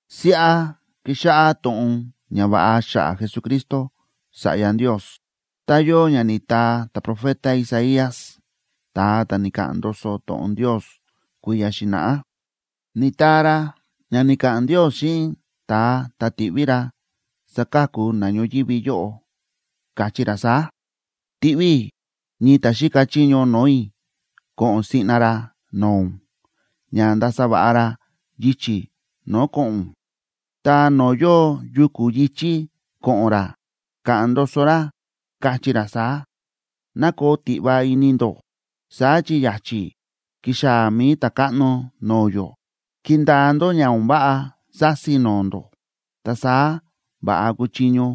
Siꞌa kíxáꞌá to̱ꞌon ñava̱ꞌa xa̱ꞌa̱ Jesucristo, Sa̱ꞌya Ndios, tá yóo ña ni̱taa ta̱profeta Isaías, ta̱a ta̱ ni̱ka̱ꞌa̱n ndoso to̱ꞌon Ndios kui̱ya̱ xi̱na̱ꞌá. Ni̱taa ra ña ni̱ka̱ꞌa̱n Ndios xíꞌin ta̱a ta̱ tiꞌví ra saka̱ku na ñoyívi yóꞌo, káchí ra saá: Tiꞌví i̱ ñii ta̱ xíka chiño no̱o̱ i̱ ko̱ꞌo̱n siꞌna ra no̱o̱ ún, ña ndasa va̱ꞌa ra yichi̱ no̱o̱ ko̱ꞌo̱n ún. Ta no̱o̱ yóo yuku̱ yi̱chí ko̱ꞌo̱n ra ka̱ꞌa̱n ndoso ra, kachí ra saá: “Ná koo tiꞌva ini ndó, saá chi ya̱chi̱ kixaa̱ mi̱i Ta̱káꞌno no̱o̱ yó; kindaa ndó ña o̱n váꞌa sási no̱o̱ ndó, ta saá va̱ꞌa kuchiño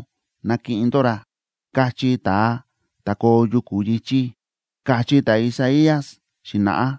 nakiꞌin ndó ra”, kachí ta̱a ta̱ koo yuku̱ yi̱chí, káchí ta̱Isaías xi̱na̱ꞌá.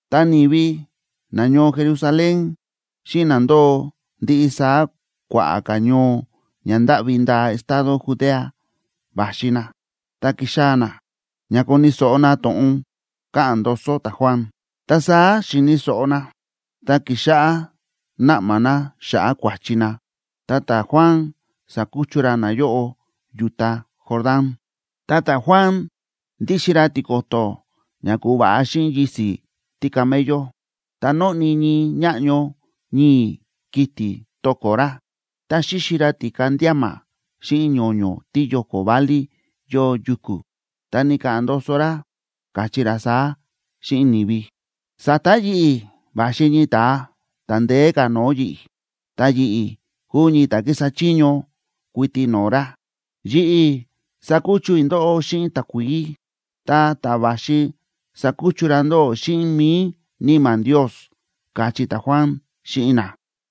Ta ni̱vi nañoo Jerusalén, xíꞌin na ndóo ndiꞌi saá kua̱ꞌa̱ ka̱ ñoo ña ndáꞌvi ndaa estado Judea va̱xi na, ta ki̱xaa̱ na ña koni̱ so̱ꞌo na to̱ꞌon káꞌa̱n ndoso ta̱Juan. Ta saá xi̱ni̱ so̱ꞌo na, ta ki̱xáꞌá náꞌma na xa̱ꞌa̱ kua̱chi na, ta ta̱Juan sa̱kuchu ra nayóꞌo yu̱ta Jordán. Ta ta̱Juan ndíxin ra tiko̱to̱ ña ku̱va̱ꞌa xíꞌin yisi̱ tícamello, ta nóꞌni ñii ñáꞌño ñii̱ kiti̱ to̱ko̱ ra. Ta xíxi ra ti̱ka ndíama xíꞌin ño̱ño̱ tíyóko̱ válí yóo yuku̱. Ta ni̱ka̱ꞌa̱n ndoso ra, káchí ra saá xíꞌin ni̱vi: ―Sa̱ta̱ yi̱ꞌi̱ va̱xi ñii ta̱a ta̱ ndeé ka̱ no̱o̱ yi̱ꞌi̱. Ta yi̱ꞌi̱ kúu ñii ta̱ kísa chiño kuiti no̱o̱ ra. Yi̱ꞌi̱ sákuchu i̱ ndóꞌó xíꞌin takuií, ta ta̱ va̱xi sakuchu ra ndóꞌó xíꞌin mi̱i Níma̱ Ndios ―káchí ta̱Juan xíꞌin na.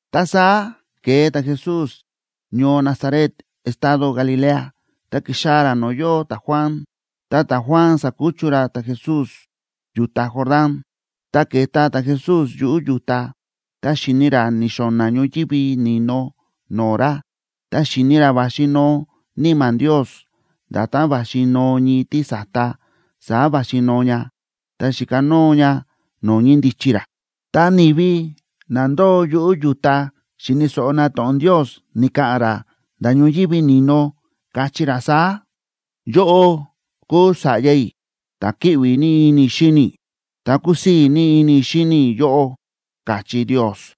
Ta saá ke̱e ta̱Jesús ñoo Nazaret estado Galilea, ta ki̱xaa̱ ra no̱o̱ yóo ta̱Juan, ta ta̱Juan sa̱kuchu ra ta̱Jesús yu̱ta Jordán. Ta ke̱ta ta̱Jesús yuꞌu̱ yu̱ta, ta xi̱ni ra ni̱xo̱na̱ ñoyívi ni̱no no̱o̱ ra, ta xi̱ni ra va̱xi noo Níma̱ Ndios, nda̱tán va̱xi noo ñii tísa̱ta, saá va̱xi noo ña, ta xi̱kanóo ña no̱o̱ ñíndichi ra. Ta ni̱vi na ndóo yuꞌu̱ yu̱ta xi̱ni̱ so̱ꞌo na to̱ꞌon Ndios ni̱ka̱ꞌa̱n ra nda̱ ñoyívi ni̱no, káchí ra saá: ―Yóꞌó kúu Sa̱ꞌya i̱, ta̱ kíꞌvi ní ini i̱ xíni i̱, ta kúsii̱ ní ini i̱ xíni i̱ yóꞌó ―káchí Ndios.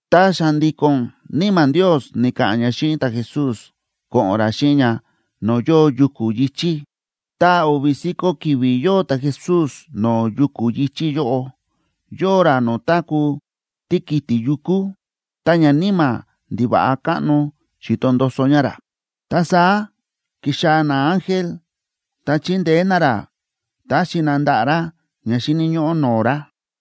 Ta xa̱ndi̱ko̱n Níma̱ Ndios ni̱ka̱ꞌa̱n ña xíꞌin ta̱Jesús ko̱ꞌo̱n ra xíꞌin ña no̱o̱ yóo yuku̱ yi̱chí. Ta o̱vi̱ si̱ko̱ ki̱vi̱ yóo ta̱Jesús no̱o̱ yuku̱ yi̱chí yóꞌo, yóo ra no̱o̱ táku̱ tíkiti̱ yukú, ta ñaníma̱ ndiva̱ꞌa káꞌno xíto ndoso ña ra. Ta saá ki̱xaa̱ naángel, ta chi̱ndeé na ra, ta̱xi na ndaꞌa̱ ra ña xíni̱ ñóꞌó no̱o̱ ra.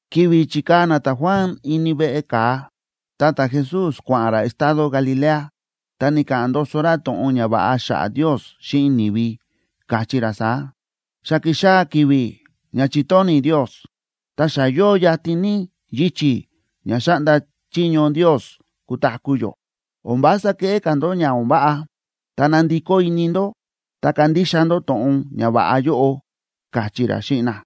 Ki̱vi̱ chi̱kaa̱ na ta̱Juan ini veꞌe ka̱a, ta ta̱Jesús kua̱ꞌa̱n ra estado Galilea, ta ni̱ka̱ꞌa̱n ndoso ra to̱ꞌon ñava̱ꞌa xa̱ꞌa̱ Ndios xíꞌin ni̱vi, káchí ra saá: ―Xa ki̱xaa̱ ki̱vi̱ ña chi̱tóni̱ Ndios. Ta xa yóo yatin ní yichi̱ ña xáꞌnda chiño Ndios kutaku̱ yó. O̱n vása keꞌé ka̱ ndó ña o̱n váꞌa, ta nandikó ini ndó ta kandixa ndó to̱ꞌon ñava̱ꞌa yóꞌo ―káchí ra xíꞌin na.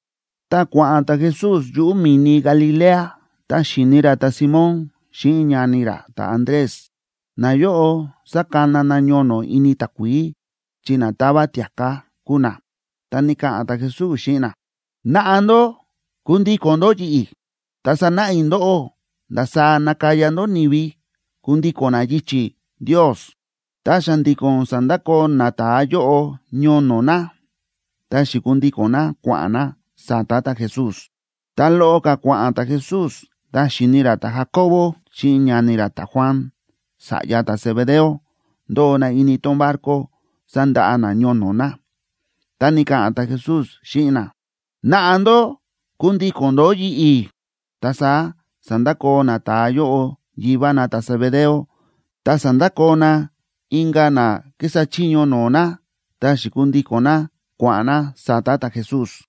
Tá kua̱ꞌa̱n ta̱Jesús yuꞌu̱ mi̱ni Galilea, ta xi̱ni ra ta̱Simóna xíꞌin ñani ra ta̱Andrés, nayóꞌo sákana na ñono̱ ini takuií, chi na táva tia̱ká kúu na. Ta ni̱ka̱ꞌa̱n ta̱Jesús xíꞌin na: ―Naꞌa ndó kundíko̱n ndó yi̱ꞌi̱, ta sanáꞌa i̱ ndóꞌó ndasaá nakaya ndó ni̱vi kundíko̱n na yichi̱ Ndios. Ta xa̱ndi̱ko̱n sa̱ndakoo nata̱a yóꞌo ñono̱ na, ta xi̱kundíko̱n na kua̱ꞌa̱n na sa̱ta̱ ta̱Jesús. Ta loꞌo ka̱ kua̱ꞌa̱n ta̱Jesús, ta xi̱ni ra ta̱Jacobo xíꞌin ñani ra ta̱Juan, sa̱ꞌya ta̱Zebedeo, ndóo na ini tón barco sándaꞌa na ñono̱ na. Ta ni̱ka̱ꞌa̱n ta̱Jesús xíꞌin na: ―Naꞌa ndó kundíko̱n ndó yi̱ꞌi̱. Ta saá sa̱ndakoo nata̱a yóꞌo yivá na ta̱Zebedeo, ta sa̱ndakoo na inka̱ na kísa chiño no̱o̱ na, ta xi̱kundíko̱n na kua̱ꞌa̱n na sa̱ta̱ ta̱Jesús.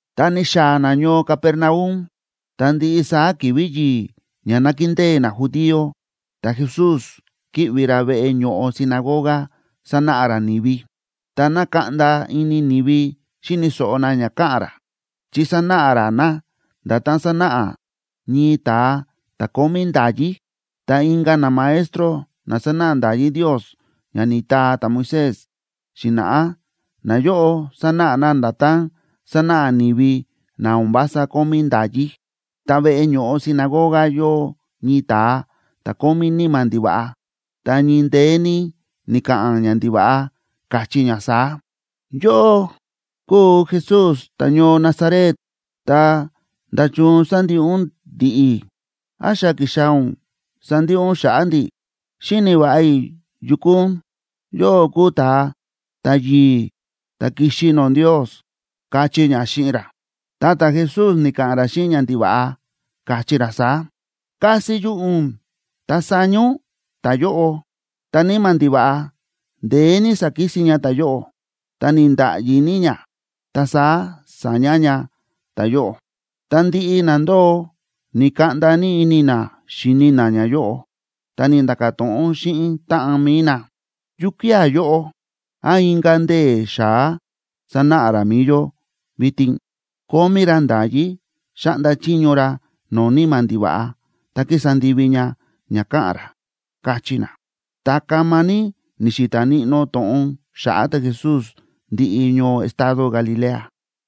Ta ni̱xaa̱ na ñoo Capernaum, ta ndiꞌi saá ki̱vi̱ yi̱i̱ ña nákindée najudío ta̱Jesús kíꞌvi ra veꞌe ño̱ꞌo sinagoga sánáꞌa ra ni̱vi. Ta na̱kaꞌnda ini ni̱vi xíni̱ so̱ꞌo na ña káꞌa̱n ra, chi sánáꞌa ra na nda̱tán sánáꞌa ñii ta̱a ta̱ kómí nda̱yí, ta inka̱ namaestro na sánáꞌa nda̱yí Ndios ña ni̱taa ta̱Moisés xi̱na̱ꞌá, nayóꞌo sánáꞌa na nda̱tán sánáꞌa ni̱vi na o̱n vása kómí nda̱yí. Ta veꞌe ño̱ꞌo sinagoga yóo ñii ta̱a ta̱ kómí níma̱ ndiva̱ꞌa, ta ñii ndeé ní ni̱ka̱ꞌa̱n ñandiva̱ꞌa, káchí ña saá: ―Yóꞌó kúu Jesús ta̱ñoo Nazaret, ta, ¿nda̱chun sándiꞌi ún ndi̱ꞌi̱? ¿Án xa ki̱xaa̱ ún sandiꞌi ún xa̱ꞌa̱ ndi̱? Xíni̱ va̱ꞌa i̱ yu kúu ún, yóꞌó kúu ta̱a ta̱yi̱i̱ ta̱ ki̱xi no̱o̱ Ndios ―káchí ña xíꞌin ra. Ta ta̱Jesús ni̱ka̱ꞌa̱n ra xíꞌin ñandiva̱ꞌa, káchí ra saá: ―¡Kasi yuꞌu̱ ún ta saña ún ta̱yóꞌo! Ta níma̱ ndiva̱ꞌa ndeé ní sa̱kisin ña ta̱yóꞌo, ta ni̱nda̱ꞌyi ní ña, ta saá sa̱ña ña ta̱yóꞌo. Ta ndiꞌi na ndóo na̱kaꞌnda ini na xíni na ñayóꞌo, ta ni̱nda̱ka̱ to̱ꞌon xíꞌin táꞌan mi̱i na: ―¿Yukía̱ yóꞌo? ¿Án inka̱ ndee̱ xa̱á sánáꞌa ra mi̱i yó vitin? Kómí ra nda̱yí xáꞌnda chiño ra no̱o̱ níma̱ ndiva̱ꞌa ta kísa ndivi ña ña káꞌa̱n ra ―káchí na. Ta kama ní ni̱xi̱ta̱ níꞌnó to̱ꞌon xa̱ꞌa̱ ta̱Jesús ndiꞌi ñoo estado Galilea.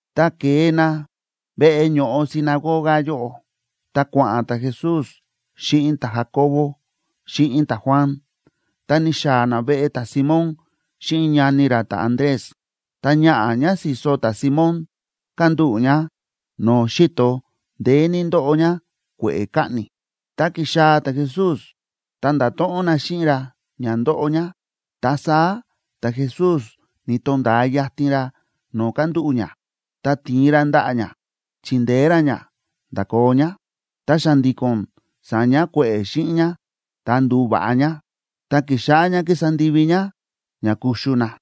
Tá ke̱e na veꞌe ño̱ꞌo sinagoga yóꞌo, ta kua̱ꞌa̱n ta̱Jesús xíꞌin ta̱Jacobo xíꞌin ta̱Juan, ta ni̱xaa̱ na veꞌe ta̱Simón xíꞌin ñani ra ta̱Andrés. Ta ñaꞌa̱ ñá si̱so ta̱Simón kándúꞌu̱ ñá no̱o̱ xi̱to, ndeé ní ndóꞌo ñá kue̱ꞌe̱ kaꞌni̱. Tá ki̱xaa̱ ta̱Jesús ta nda̱to̱ꞌon na xíꞌin ra ña ndóꞌo ñá. Ta saá ta̱Jesús ni̱to̱nda̱a yatin ra no̱o̱ kándúꞌu̱ ñá, ta ti̱in ra ndaꞌa̱ ñá chindeé ra ñá ndakoo ñá. Ta xa̱ndi̱ko̱n sa̱ña kue̱ꞌe̱ xíꞌin ñá ta ndu̱va̱ꞌa ñá, ta ki̱xáꞌá ñá kísa ndivi ñá ña kuxu na.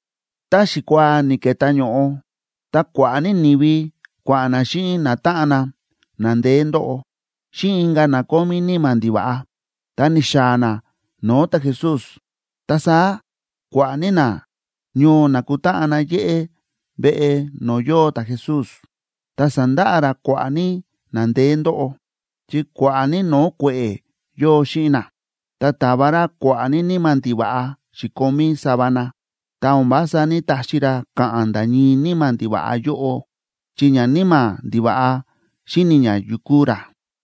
Tá xikuaa ni̱ke̱tá ño̱ꞌo, ta kua̱ꞌa̱ ní ni̱vi kua̱ꞌa̱n na xíꞌin natáꞌan na, na ndeé ndóꞌo, xíꞌin inka̱ na kómí níma̱ ndiva̱ꞌa, ta ni̱xaa̱ na no̱o̱ ta̱Jesús. Ta saá kua̱ꞌa̱ ní nañoo na̱kutáꞌan na yéꞌé veꞌe no̱o̱ yóo ta̱Jesús, ta sa̱ndaꞌa ra kua̱ꞌa̱ ní na ndeé ndóꞌo, chi kua̱ꞌa̱ ní no̱o̱ kue̱ꞌe̱ yóo xíꞌin na. Ta ta̱va ra kua̱ꞌa̱ ní níma̱ ndiva̱ꞌa xi̱komí sava na, ta o̱n vása ní‑taxi ra ka̱ꞌa̱n nda̱ ñii níma̱ ndiva̱ꞌa yóꞌo, chi ñaníma̱ ndiva̱ꞌa xíni̱ ña yu kúu ra.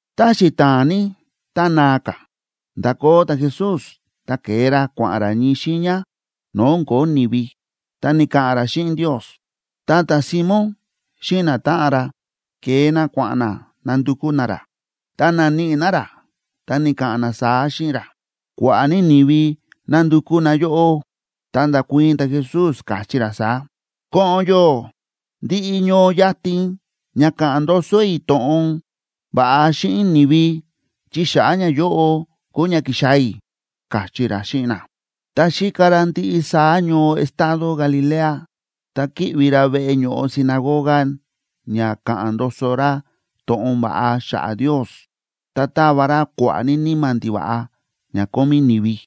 Ta xita̱a̱n ní ta naa ka̱, nda̱koo ta̱Jesús ta ke̱e ra kua̱ꞌa̱n ra ñii xiiña no̱o̱ o̱n ko̱ó ni̱vi, ta ni̱ka̱ꞌa̱n ra xíꞌin Ndios. Ta ta̱Simón xíꞌin natáꞌan ra ke̱e na kua̱ꞌa̱n na nandukú na ra, ta na̱níꞌi na ra, ta ni̱ka̱ꞌa̱n na saá xíꞌin ra: ―Kua̱ꞌa̱ ní ni̱vi nándukú na yóꞌó. Ta nda̱kuii̱n ta̱Jesús, káchí ra saá: ―Ko̱ꞌo̱n yó ndiꞌi ñoo yatin ña ka̱ꞌa̱n ndoso i̱ to̱ꞌon va̱ꞌa xíꞌin ni̱vi, chi xa̱ꞌa̱ ñayóꞌo kúu ña ki̱xaa̱ i̱ ―káchí ra xíꞌin na. Ta xíka ra ndiꞌi saá ñoo estado Galilea, ta kíꞌvi ra veꞌe ño̱ꞌo sinagoga ña ka̱ꞌa̱n ndoso ra to̱ꞌon va̱ꞌa xa̱ꞌa̱ Ndios, ta táva ra kua̱ꞌa̱ ní níma̱ ndiva̱ꞌa ña kómí ni̱vi.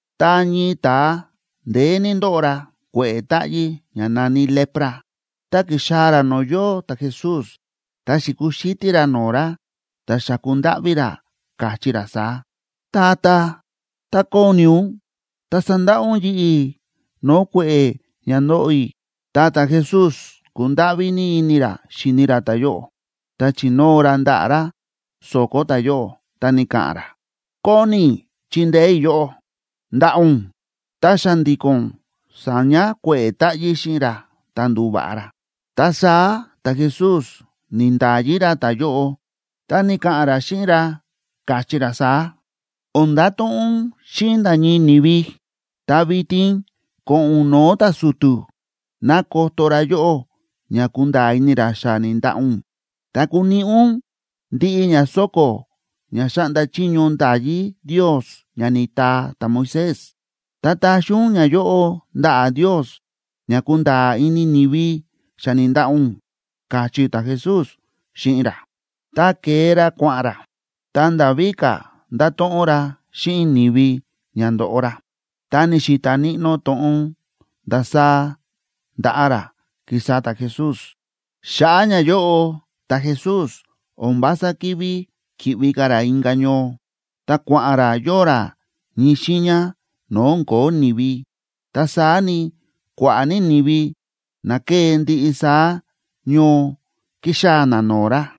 Ta ñii ta̱a, ndeé ní ndóꞌo ra kue̱ꞌe̱ táꞌyí ña na̱ní lepra, ta ki̱xaa̱ ra no̱o̱ yóo ta̱Jesús, ta xi̱kuxítí ra no̱o̱ ra, ta xa̱ku ndáꞌví ra, káchí ra saá: ―Tata, tá kóni ún, ta sandaꞌa ún yi̱ꞌi̱ no̱o̱ kue̱ꞌe̱ ña ndóꞌo i̱. Ta ta̱Jesús kúndáꞌví ní ini ra xíni ra ta̱yóꞌo, ta chi̱nóo ra ndaꞌa̱ ra so̱ko̱ ta̱yóꞌo, ta ni̱ka̱ꞌa̱n ra: ―Kóni i̱ chindeé i̱ yóꞌó. ¡Ndaꞌa ún! Ta xa̱ndi̱ko̱n sa̱ña kue̱ꞌe̱ táꞌyí xíꞌin ra, ta ndu̱va̱ꞌa ra. Ta saá ta̱Jesús ni̱nda̱yi ra ta̱yóꞌo, ta ni̱ka̱ꞌa̱n ra xíꞌin ra, káchí ra saá: ―O̱n ndato̱ꞌon ún xíꞌin nda̱ ñii ni̱vi. Ta vitin ko̱ꞌo̱n ún no̱o̱ ta̱su̱tu̱ ná koto ra yóꞌó ña kunda̱a̱ ini ra xa ni̱ndaꞌa ún. Ta kuniꞌi ún ndiꞌi ña so̱ko̱ ña xáꞌnda chiño nda̱yí Ndios ña ni̱taa ta̱Moisés, ta taxi ún ñayóꞌo ndaꞌa̱ Ndios ña kunda̱a̱ ini ni̱vi xa ni̱ndaꞌa ún ―káchí ta̱Jesús xíꞌin ra. Ta ke̱e ra kua̱ꞌa̱n ra, ta nda̱ víka̱ nda̱to̱ꞌon ra xíꞌin ni̱vi ña ndo̱ꞌo ra, ta ni̱xi̱ta̱ níꞌnó to̱ꞌon ndasaá nda̱ꞌa ra, ki̱sa ta̱Jesús. Xa̱ꞌa̱ ñayóꞌo ta̱Jesús o̱n vása ki̱ví ki̱ꞌvi ka̱ ra inka̱ ñoo, ta kua̱ꞌa̱n ra yóo ra ñii xiiña no̱o̱ o̱n ko̱ó ni̱vi. Ta saá ni, kua̱ꞌa̱ ní ni̱vi na ke̱e ndiꞌi saá ñoo kíxaa̱ na no̱o̱ ra.